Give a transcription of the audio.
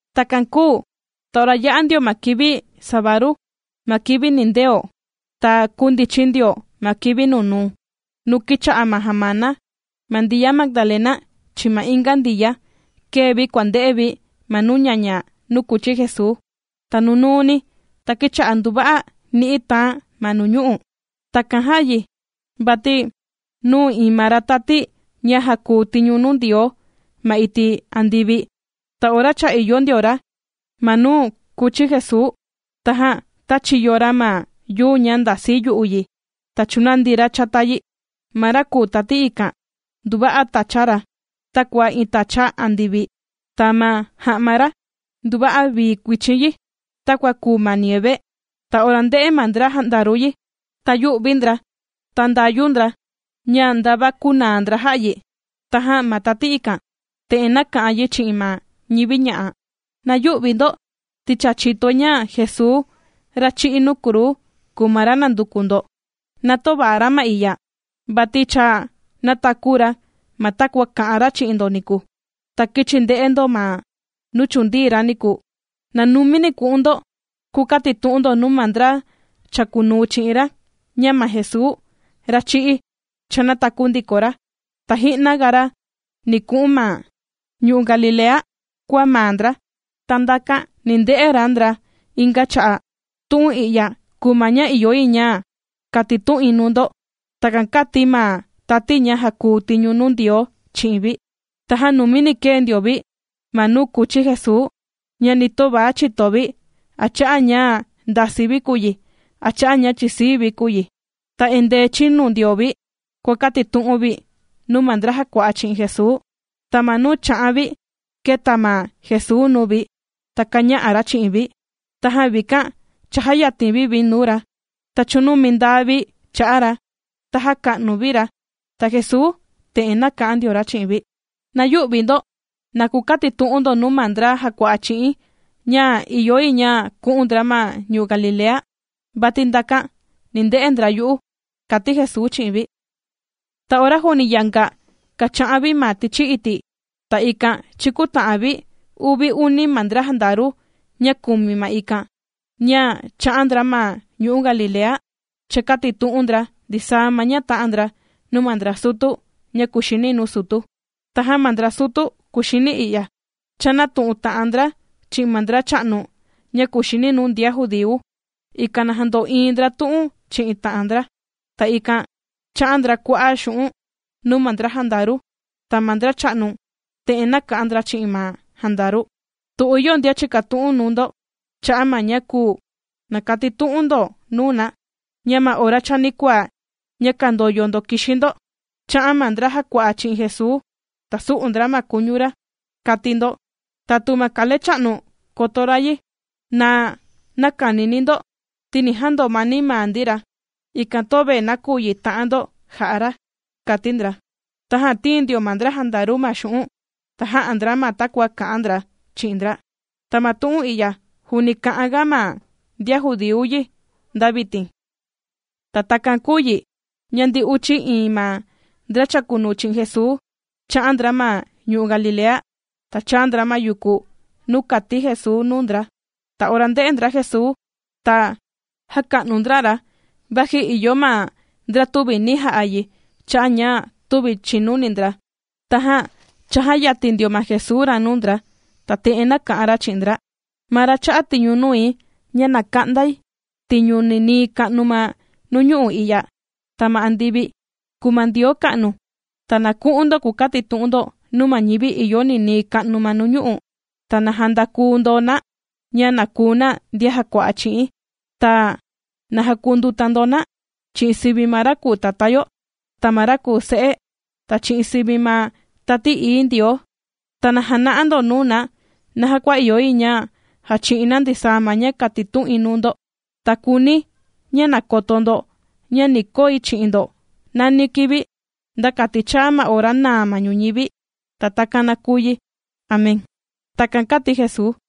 Takan kūu ta ora yā'a ndio ma kivi sabadu, ma kivi nindeo, ta kūndichin ndio ma kivi nunuu, nuu kìcha'a ma jamana. Ma Ndiya Magdalena, chi'in ma inga Ndiya, kēe vi kūa nde'e vi ma nuu ñaña nuu kūchi Jesuu. Ta nunuuni, ta kīcha'a nduva'a ni'i tàan ma nuñu'u'. Takan jā'a yi, vati nūu iin ma ra tati ña jàkuu tiñu nuu Ndioo ma iti' andivi. Ta ora cha ìyo ndio ra ma nuu kūchi Jesuu, tajan tāchiyo ra ma yuu ña ndasi yu'u yi, ta chūnandi ra chata yi. Ma ra kùu tati ikan, nduva'a tacha ra takua iin tacha andivi, ta ma ja'ma ra nduva'a vii kuichin yi, takua kùu ma nieve. Ta ora ndē'e ma ndra jandaru yi, ta yū'vi ndra, ta ndāyu ndra, ña ndava kūnaa ndra jà'a yi. Tajan ma tati ikan, te'en nāka'an yi chi'in ma ñivi ña'a: ―Na yü'vi ndo, ti cha chìtoi, ña Jesuu, ra chī'í nuu kruu kùu ma ra nànduku ndo. Na töva ra ma i'ya, vati cha nātaku ra ma takua kā'an ra chi'in ndo niku. Na kichi nde'e ndo ma nuu chūndii ra niku. Na numini ku'un ndo, kukatitu'un ndo nuu ma ndra chàkunuu chi'in ra, ña ma Jesuu, ra chī'í, cha nātaku ndiko ra, ta ji'na ga ra ni ku'un ma ñu'u' Galilea kua maa ndra, ta ndakan ni nde'e ra ndra inga cha'a'. Tu'un i'ya kùu ma ña ìyo yi ña katitu'in nuu ndo. ―Takan kāti ma tati ña jàkuu tiñu nuu Ndioo chi'in vi. Tajan numini kēe ndio vi ma nuu kūchi Jesuu, ña ni töva chìto vi, a cha'a' ña ndasii vi kùu yi, a cha'a' ña chìsii vi kùu yi. Ta endee chìnu ndio vi kuàkatitu'un vi nuu ma ndra jàkua'a chi'in Jesuu. Ta ma nuu kàcha'an vi kēta ma Jesuu nuu vi, ta kāña'a ra chi'in vi. Tajan vikan, chājayatin vi vi nuu ra, ta chūnumindaa vi cha'a ra, ta jāka'nu vi ra. Ta Jesuu te'en nāka'an ndio ra chi'in vi: ―Na yü'vi ndo. Na kukatitu'un ndo nuu ma ndra jàkua'a chi'i̱n, ña ìyo yi ña ku'un ndra ma ñu'u' Galilea, vati ndakan ni nde'e ndra yu'u ―kàti Jesuu chi'in vi. Ta ora juuni yanga kàcha'an vi ma tichi iti', ta ikan chīkuta'an vi uvi uni ma ndra jandaru, ña kūmi ma ikan, ña chā'an ndra ma ñu'u' Galilea, chākatitu'un ndra ndisaa ma ña tā'an ndra nuu ma ndra sutu ña kuxini nuu sutu. Tajan ma ndra sutu kuxini i'ya, chānatu'un ta'an ndra chi'in ma ndracha'nu ña kuxini nuu ndian judíu, ikan na jando'iin ndra tu'un chi'in ta'an ndra. Ta ikan chā'a ndra kua'a' xu'un' nuu ma ndra jandaru. Ta ma ndracha'nu te'en nāka'an ndra chi'in ma jandaru: ―Tu ìyo ndian chìkatu'un nuu ndo cha'a' ma ña kūu, na katitu'un ndo nuu na, ña ma ora chanikuaa ña kàndoyo ndo kìxi ndo, chā'an ma ndra jàkua'a chi'in Jesuu, ta sū'u ndra ma kuñu ra, kati ndo. Ta tu ma kalecha'nu koto ra yi, na näkanini ndo ti ni jandomani maa ndi ra, ikan töve nakuyi ta'an ndo jà'a ra ―kati ndra. Tajan tīin ndio ma ndra jandaru ma xu'un', ta jā'a ndra ma takua kā'an ndra chi'in ndra. Ta ma tu'un i'ya juuni kà'an ga ma ndian judíu yi nda vitin. Ta takan kūu yi, ña ndi uchi iin ma ndra chàkunuu chi'in Jesuu, chā'an ndra ma ñu'u' Galilea, ta chāa ndra ma yuku nuu kāti Jesuu nuu ndra. Ta ora ndē'e ndra Jesuu, ta jāka'nu ndra ra, vaji ìyo ma ndra tüvi nī ja'a yi cha'a' ña tüvi chìnuni ndra. Tajan chājayatin ndio ma Jesuu ra nuu ndra, ta te'en nāka'an ra chi'in ndra: ―Ma Ra chā'a tiñu nui, ña na ka'ndai tiñu ninii ka'nu ma nuñu'u' i'ya, ta ma andivi, kùu ma Ndioo ka'nu. Ta na ku'un ndo kukatitu'un ndo nuu ma ñivi ìyo ninii ka'nu ma nuñu'u', ta na jandaku ndo na, ña na kuu na ndian jàkua'a chi'i̱n. Ta na jakunduta ndo na, chi'in sivi ma ra kùu Tatá yo, ta ma ra kùu Se'e, ta chi'in sivi ma Tati Ií Ndioo. Ta na jana'a ndo nuu na, naja kua ìyo yi ña jachi'in na ndisaa ma ña kātitu'in nuu ndo. Ta kùuni̱ ña na koto ndo, ña ni koi chi'in ndo nani kivi, nda kati chàa ma ora nàa ma ñuñivi. Ta takan na kùu yi. Amén. ―Takan kāti Jesuu.